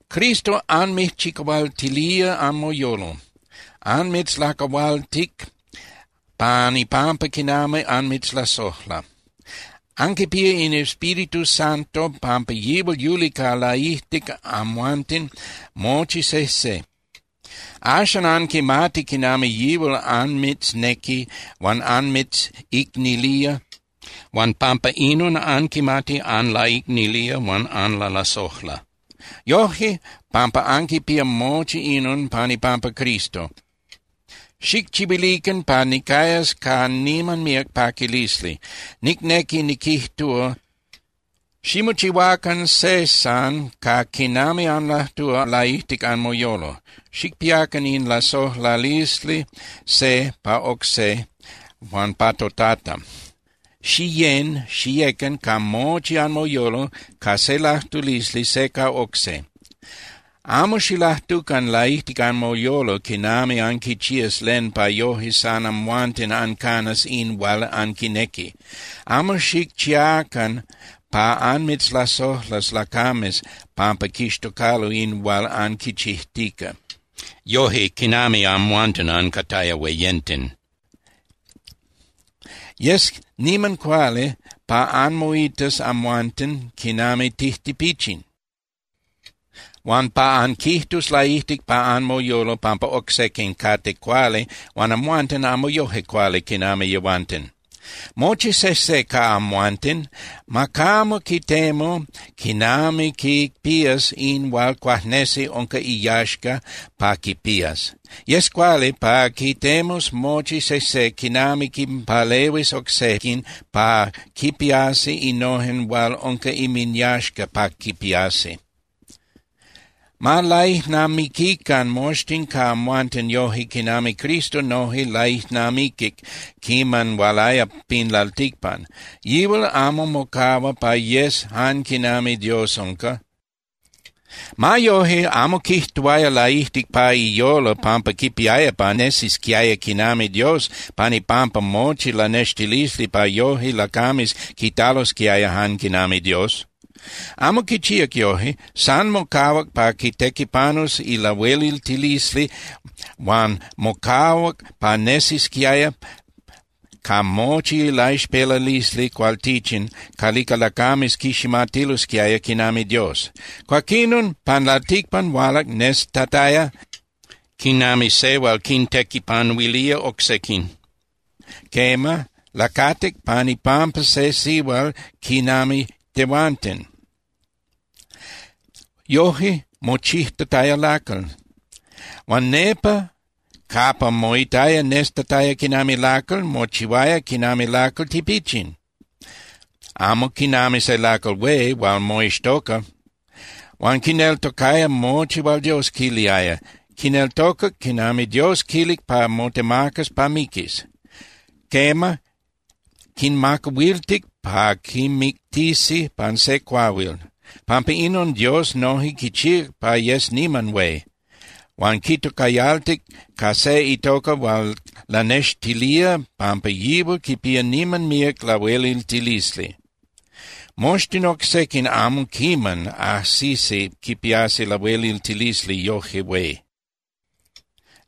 Cristo anmijchicahualtilía anmoyolo, anmitzlacahualtic pan ipampa quinami anmitzlasojla. Anquipía in Espíritu Santo pampa yihual yuli ca laijtic amhuanten mochi sejse. Axan anquimati quinami yihual anmitznequi huan anmitzicnilía huan pampa inon anquimati anlaicnilía huan anlalasojla. Yoje pampa anquipía mochi inon pan ipampa Cristo, xijchihuilican pa nicayas ca niman míac paquilisli. Nicnequi niquijtúa, ximochihuacan se san ca quinami anlajtúa laijtic anmoyolo. Xicpiacan in lasojlalisli se pa oc se huan pa toTata. Xiyén (Xiyecan) ca mochi anmoyolo ca se lajtulisli se ca oc se. Amo xilajtucan laijtic anmoyolo quinami anquichías len pa yoje san amhuanten ancanas in hual anquinequi. Amo xicchiacan pa anmitzlasojlas lacames pampa quixtocalo in hual anquichijtica, yoje quinami amhuanten ancataya hueyenten. Yes niman cuali pa anmoitas amhuanten quinami tijtipichin, huan pa anquijtus laijtic pa anmoyolo pampa oc sequin cate cuali huan amhuanten amo yoje cuali quinami yehuanten. Mochi sejse ca amhuanten ma camo quitemu quinami quipías in hual cuajnesi unca iyaxca pa quipías. Yes cuali pa quitemus mochi sejse quinami quinpalehuis oc sequin pa quipiasi innojen hual unca inminyaxca pa quipiasi. Ma laijnamiquican moxtin ca amhuanten yoje quinami Cristo noje laijnamiquic quiman hualaya pin lalticpan. Yihual amo mocahua pa yes jan quinami Dios unca. Ma yoje, amo quijtuaya laijtic pa iyolo pampa quipiaya pa nesisquiaya quinami Dios pan ipampa mochi lanextilisli pa yoje lacames quitalosquiaya jan quinami Dios. Amo quichíac yoje. San mocahuac pa quitequipanus ilahueliltilisli huan mocahuac pa nesisquiaya ca mochi ilaixpelalisli cualtichin calica lacames quiximatilosquiaya quinami Dios. Cuaquinon, pan lalticpan hualac nestataya quinami se hual quintequipanuilía oc sequin. Quema, lacatic pan ipampa se sihual quinami tehuanten, yoje mochijtataya lacal. Huan nepa capa moitaya nestataya quinami lacal, mochihuaya quinami lacal tipichin, amo quinami se lacal hué hual moixtoca. Huan quineltocaya mochi hual Dios quiliaya, quineltocac quiman Dios quilic pa motemacas pa miquis. Quema, quinmacahuiltic pa quimictisi pan se cuahuil. Pampa inon, Dios noje quichíac pa yes niman hué, huan quitocayaltic ca se itoca hual lanextilía pampa yihual quipía niman míac lahueliltilisli. Moxtin oc sequin amo quiman ajsisi quipiasi lahueliltilisli yoje hué.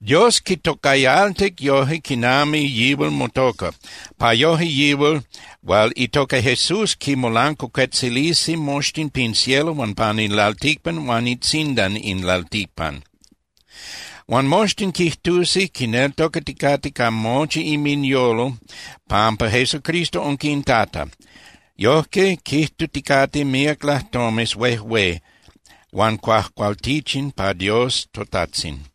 Dios quitocayaltic yoje quinami yihual motoca, pa yoje yihual hual itoca Jesús quimolancuacuetzilisi moxtin pin cielo huan pan in lalticpan huan itzindan in lalticpan. Huan moxtin quijtusi quineltocaticate ca mochi inminyolo pampa Jesucristo unca in Tata, Yojque quijtuticate míac lajtomes huejué huan cuajcualtichin pa Dios toTajtzin.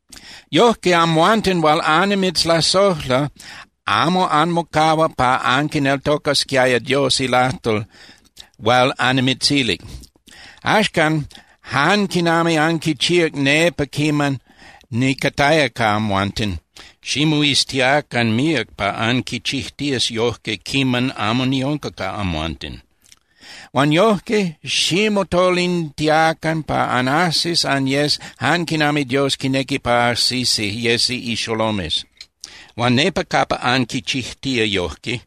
yojque, amhuanten hual annimitzlasojla, amo anmocahuac pa anquineltocasquiaya Dios ilajtol hual annimitzilic. Axcan, jan quinami anquichíac nepa quiman nicataya ca amhuanten, ximoiztiacan míac pa anquichijtías yojque quiman amo niunca ca amhuanten. Huan yojque ximotolintiacan pa anajsis anyes jan quinami Dios quinequi pa ajsisi yesi ixolomes. Huan nepa capa anquichijtía yojque,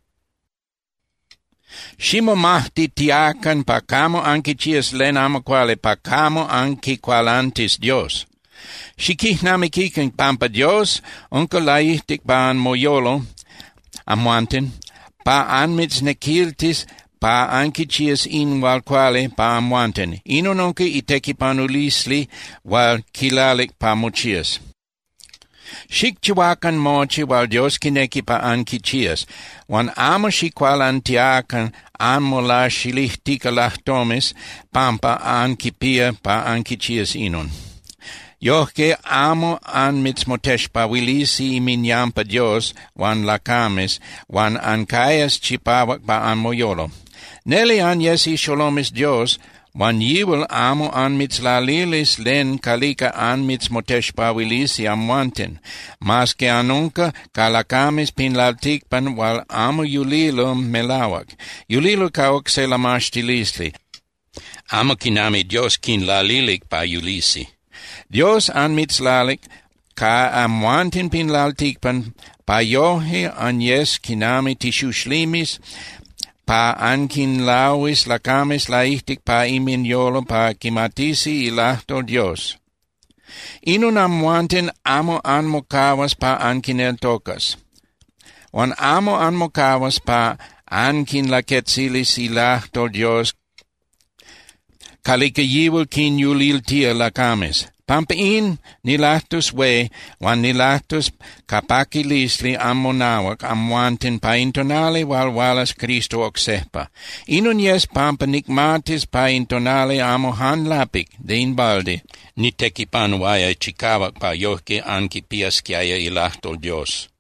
ximomajtitiacan pa camo anquichías len amo cuali pa camo anquicualantis Dios. Xiquijnamiquican pampa Dios unca laijtic pa anmoyolo amhuanten pa anmitznequiltis pa anquichías in hual cuali pa amhuanten. Inon unca itequipanulisli hual quilalic pa mochías. Xicchihuacan mochi hual Dios quinequi pa anquichías, huan amo xicualantiacan anmolaxilijtica lajtomes pampa anquipía pa anquichías inon. yojque amo anmitzmotexpahuilisi inminyampa Dios huan lacames huan ancayas chipahuac pa anmoyolo. Neli anyes ixolomes Dios huan yihual amo anmitzlalilis len calica anmitzmotexpahuilisi amhuanten, mas que anunca ca lacames pin lalticpan hual amo yulilo melahuac. Yulilo ca oc se lamaxtilisli, amo quinami Dios quinlalilic pa yulisi. Dios anmitzlalic ca yehuanten pin lalticpan pa yoje anyes quinami tixuxlimes pa anquinlahuis lacames laijtic pa inminyolo pa quimatisi ilajtol Dios. Inon amhuanten amo anmocahuas pa anquineltocas. Huan amo anmocahuas pa anquinlaquetzilis ilajtol Dios calica yihual quinyuliltía lacames. Pampa in, nilajtus hué huan nilajtus ca paquilisli anmonahuac amhuanten pa in tonali hual hualas Cristo oc sejpa. Inon yes pampa nicmatis pa in tonali amo jan lapic (de in balde) nitequipanuaya chicahuac pa yojque anquipiasquiaya ilajtol Dios.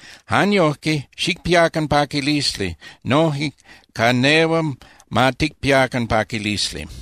Jan yojque, xicpiacan paquilisli, noje ca nehual ma ticpiacan paquilisli.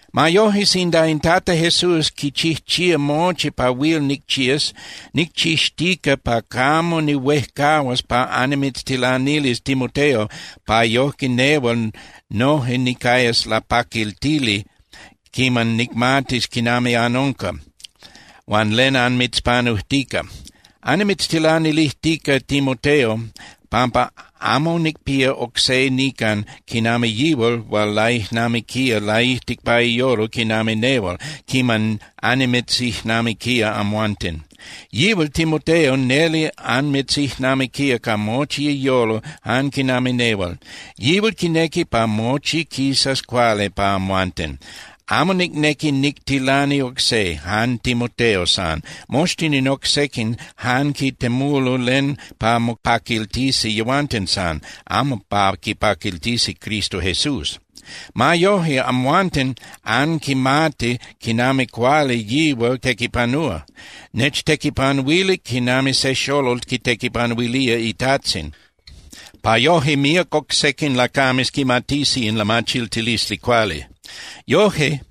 Ma yoje, sinda in Tata Jesús quichijchía mochi pa huil nicchías, nicchixtica pa camo nihuejcahuas pa annimitztilanilis Timoteo pa yojque nehual noje nicayas lapaquiltili quiman nicmatis quinami anunca huan len anmitzpanujtica. Annimitztilanilijtica Timoteo, pampa amo nicpía oc se nican quinami yihual hual laijnamiquía laijtic pa iyolo quinami nehual quiman annimitzijnamiquía amhuanten. Yihual Timoteo neli anmitzijnamiquía ca mochi iyolo jan quinami nehual. Yihual quinequi pa mochi quisas cuali pa amhuanten. Amo nicnequi nictilani oc se, jan Timoteo san. Moxtin in oc sequin jan quitemulo len pa mopaquiltisi yehuanten san, amo pa quipaquiltisi Cristo Jesús. Ma yoje, amhuanten anquimati quinami cuali yihual tequipanúa. Nechtequipanuilic quinami se xolol quitequipanuilía itajtzin, pa yoje míac oc sequin lacames quimatisi in lamachiltilisli cuali. Yoje,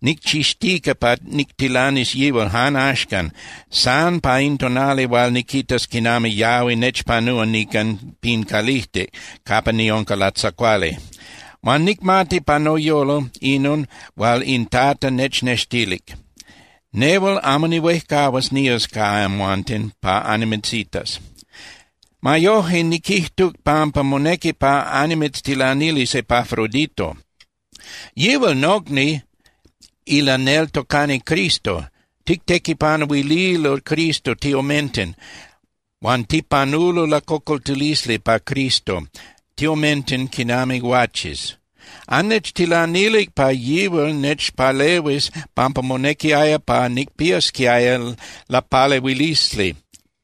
nicchixtica pa nictilanis yihual jan axcan, san pa in tonali hual niquitas quinami yahui nechpanúa nican pin calijtic capa niunca latzacuali. Huan nicmati pa noyolo inon hual in Tata nechnextilic. Nehual amo nihuejcahuas nías ca amhuanten pa annimitzitas. Ma yoje, niquijtuc pampa monequi pa annimitztilanilis Epafrodito. Yihual nocni ilaneltocani Cristo, tictequipanuililo Cristo tiomenten, huan tipanulo lacocoltilisli pa Cristo tiomenten quinami guaches. Annechtilanilic pa yihual nechpalehuis pampa monequiaya pa nicpiasquiaya lapalehuilisli.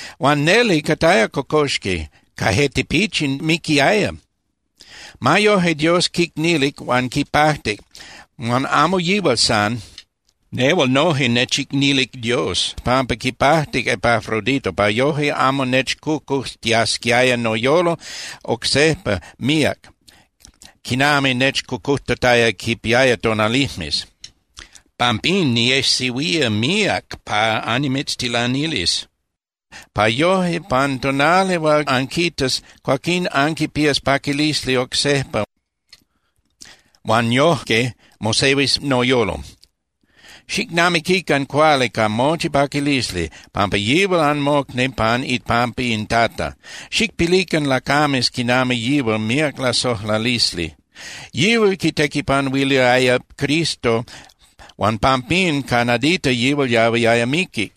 Huan neli cataya cocoxqui, ca je tipichin miquiaya. Ma yoje, Dios quicnilic huan quipajtic, huan amo yihual san. Nehual noje nechicnilic Dios pampa quipajtic Epafrodito pa yoje amo nechcocujtiasquiaya noyolo oc sejpa míac quinami nechcocujtataya quipiaya tonalijmes. Pampín, niejsehuía míac pa annimitztilanilis, pa yoje pan tonali hual anquitas, cuaquín anquipías paquilisli oc sejpa huan yojque mosehuis noyolo. Xicnamiquican cuali ca mochi paquilisli, pampa yihual anmocni pan ipampa in Tata. Xicpilican lacames quinami yihual míac lasojlalisli. Yihual quitequipanuiliaya Cristo huan pampín ca nadita yihual yahuiaya miqui.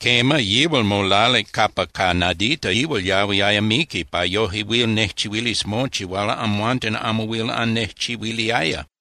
Quema, yihual molalic capa ca nadita yihual yahuiaya miqui pa yoje huil nejchihuilis mochi hual amhuanten amo huil annejchihuiliaya.